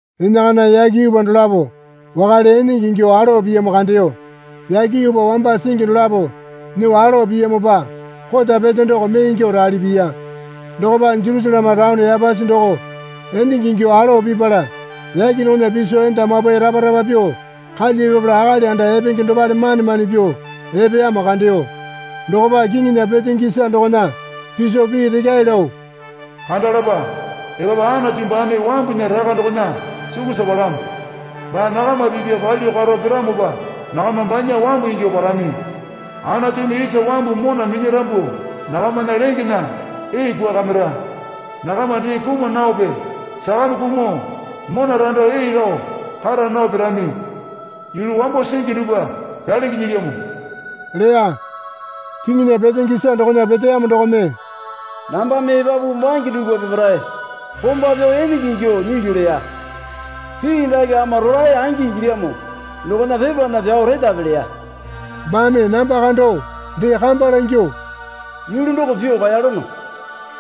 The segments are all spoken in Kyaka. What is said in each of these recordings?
Enakana yake yuupa dolapo wakale enenge ingyuo alowa piyamo kandeyo. Yake yuupa wamba singi dolapo nyuo alowa piyamopa kota pete doko mee ingyuo rali piya. Dokopa Jerusaleme taone yapasi doko enenge ingyuo alowa pipala yake dokona piso enda mapwae rapa rapa pyuo kalya pipala akali anda epenge dopale mane mane pyuo epeyamo kandeyo. Dokopa kiŋinya petenge isa dokona piso pii rekyae lao, Kandalapa epapu Anatu baame wambunya raka dokona sukusa palamo. Baa nakama pipa palyuo karo piramopa nakama banya wambu ingyuo parami. Anatumi isa wambu mona minyarambu nakamana lengena ee kwuakamira. Nakama dee kuma naope sakame kumuo mona rando ee lao kara nao pirami. Yulu wambo singi dupwa pyalingi nyilyamo leya. Kiŋinya petenge isa dokona peteyamo dokome, Nambame epapu bange dupwa peparae komba pyao enenge ingyuo nyilyu leya. Pii dake ama rolae angi ingilyamo dokona pepana pyao retape leya. Baame namba kando dee kamba langyuo, Yulu doko pyuo kaeyalono.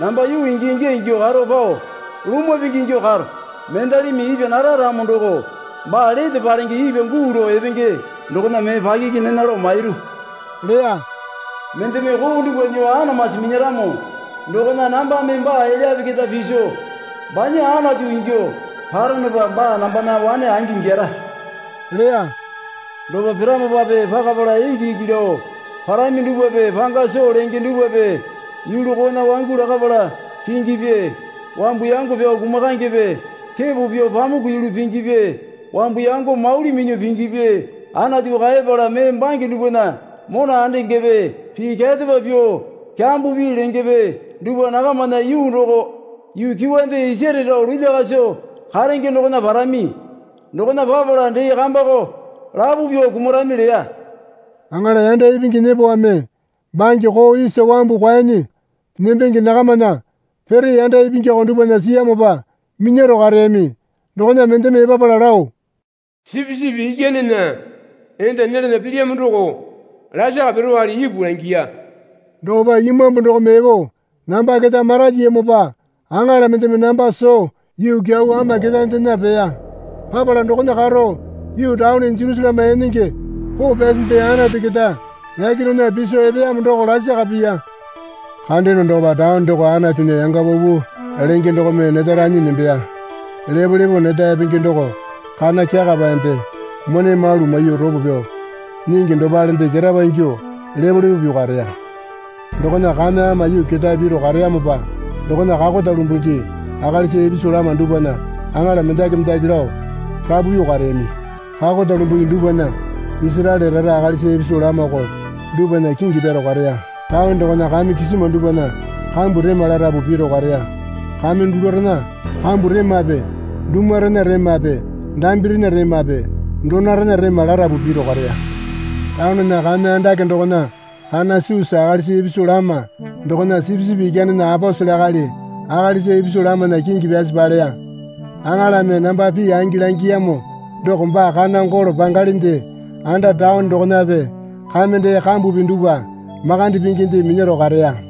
Namba yuu ingya ingya ingyuo karo pao lumwa pingi ingyuo karo. Mendalimi ipwa nara ramo doko baa lete palenge ipwa guu lao epenge dokona mee pakiki nena lao mairu leya. Mendeme koo dupwa nyuo anamasi minyaramo dokona nambame baa elyape keta piso banya Anatu ingyuo paronopa baa nambana wane angi ingyara leya. Dopa piramopape pakapala iki iki lao parami dupwape panga soo lenge dupwape yulu koona wangu lakapala pingipi wambu yango pyao kumakaengepe kepo pyuo pamuku yulu pingipi wambu yango mauli minyuo pingipi Anatu kaepala mee bange dupwana mona andengepe pii kyarepa pyuo kyambo pii lengepe dupwa nakamana yuu doko yuu kyuwande isare rao lulya kaso karenge dokona parami. Dokona papala dee kambako lapo pyuo kumarami leya. Aŋala yanda ipingi nyepowame bange koo isa wambu kwuanyi nembenge nakamana pere yanda ipingyako dupwana siyamopa minyaro kareyami dokona mendeme epapala lao Sipisipi Ikyanena enda nyelana pilyamo doko lasaka pirowale ipu langiya. Dokopa imambu doko epo namba keta maralyiyamopa aŋala mendeme namba soo yuu kyau ama ketaendena peya. Papala dokona karo yuu taone Jerusaleme enenge poo pyasinde Anatu keta yake dokona piso epeyamo doko lasaka piya. Kandeyono dokopa taone doko Anatunya yanga paupau lenge dokome neta ranyi nembeya. Lepolepo neta epenge doko kana kyakapaende mone malu maiyuo ropo pyao nyingi dopalende ketapa ingyuo lepolepo pyuo kareya. Dokona kame ama yuu ketae piro kareyamopa dokona kakota lumbungi akalisa ipisu lama dupwana aŋala mendaki mendaki lao rapu pyuo kareyami. Kakota lumbungi dupwana Isaraele rara akalisa ipisu lamako dupwana kingi pyaro kareya. Taone dokona kame kisima dupwana kambu rema larapu piro kareya. Kame dulurena kambu remape dumurena remape dambirena remape donorena rema larapu piro kareya. Taonena kame andake dokona kana susa akalisa ipisu lama dokona Sipisipi Ikyanena aposele akali akalisa ipisu lamana kingi pyasi paleya. Aŋalame namba pii angi langiyamo doko baa kana golo pangalinde anda taone dokonape kame dee kambupi dupwa makande pinginde minyaro kareya.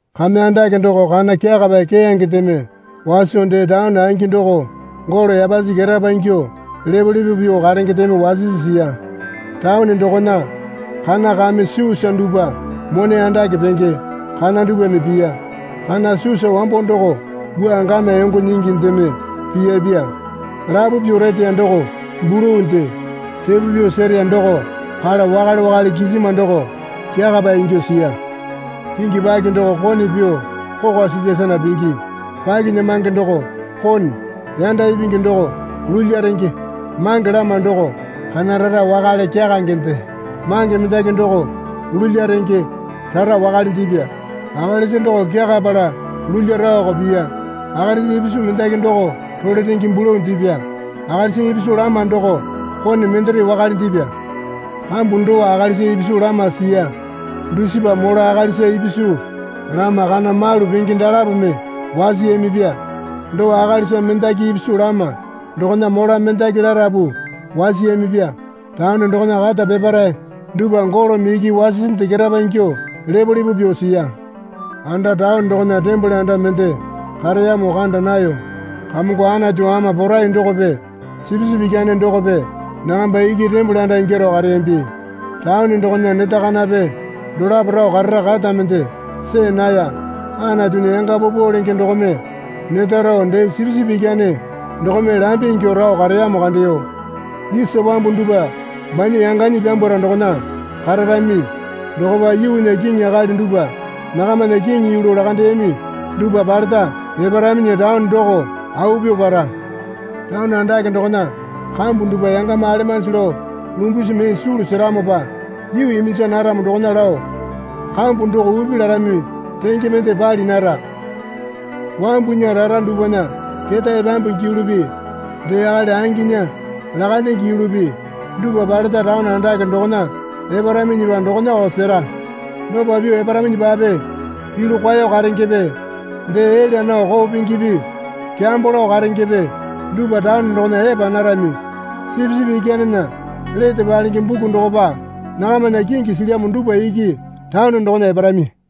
Kame andake doko kana kyakapae keyangendeme waso dee taone angi doko golo yapasi ketapa ingyuo lepolepo pyuo karengendeme wasisi siya. Taone dokona kana kame susa dupwa mone andake penge kana dupwame piya. Kana susa wambo doko wua gamya yongo nyingindeme piyapya lapo pyuo reteya doko bulu dee repo pyuo sereya doko kala wakale wakale kisima doko kyakapae ingyuo siya. Kingi paki doko kone pyuo kokwa silya sana pingi. Pakinyamange doko kone yanda ipingi doko lulya renge mange lama doko kana rara wakale kyakangende. Mange mendaki doko lulya renge rara wakalendepya. Akalisa doko kyakapala lulya raoko piya. Akalisa ipisu mendaki doko role renge bulundepya. Akalisa ipisu lama doko kone mendere wakalendepya. Kambu dowa akalisa ipisu lama siya dusipa mola akalisa ipisu lama kana malu penge dalapome wasiyamipya. Dowa akalisa mendaki ipisu lama dokona mola mendaki larapu wasiyamipya. Taone dokona kata peparae dupwa golome iki wasisinde ketapa ingyuo lepolepo pyuo siya. Anda taone dokona tembole anda mende kareyamo kanda nayo. Kamongo Anatu Ama Porai dokope Sipisipi Ikyane dokope nakamba iki tembole anda ingyaro kareyambi. Taone dokona neta kanape dolapo rao karara kata mende see naya. Anatunya yanga paupau lenge dokome neta rao dee Sipisipi Ikyane dokome lambe ingyuo rao kareyamo kandeyo. Isa wambu dupwa banya yanganyi pyambwara dokona kararami. Dokopa yuunya kiŋi akali dupwa nakamana kiŋi yulu lakandeyami dupwa paleta eparaminyi taone doko au pyuo para. Taone andake dokona kambu dupwa yangama alemanji lao lumbasi mee sulu seramopa yuu iminja naramo dokona lao kambu doko upi larami renge mende pali nara. Wamubunya rara dupwana ketae pyambungi yulupi dee akali anginya lakandenge yulupi dupwa paleta taone andake dokona eparaminyipa dokonako sera. Dopa pyuo eparaminyipape yulu kwao karengepe dee elya nao koo pingipi kyambo lao karengepe dupwa taone dokona epa narami. Sipisipi Ikyanena lete palenge buku dokopa nakamana kingi silyamo dupwa iki taone dokona eparami.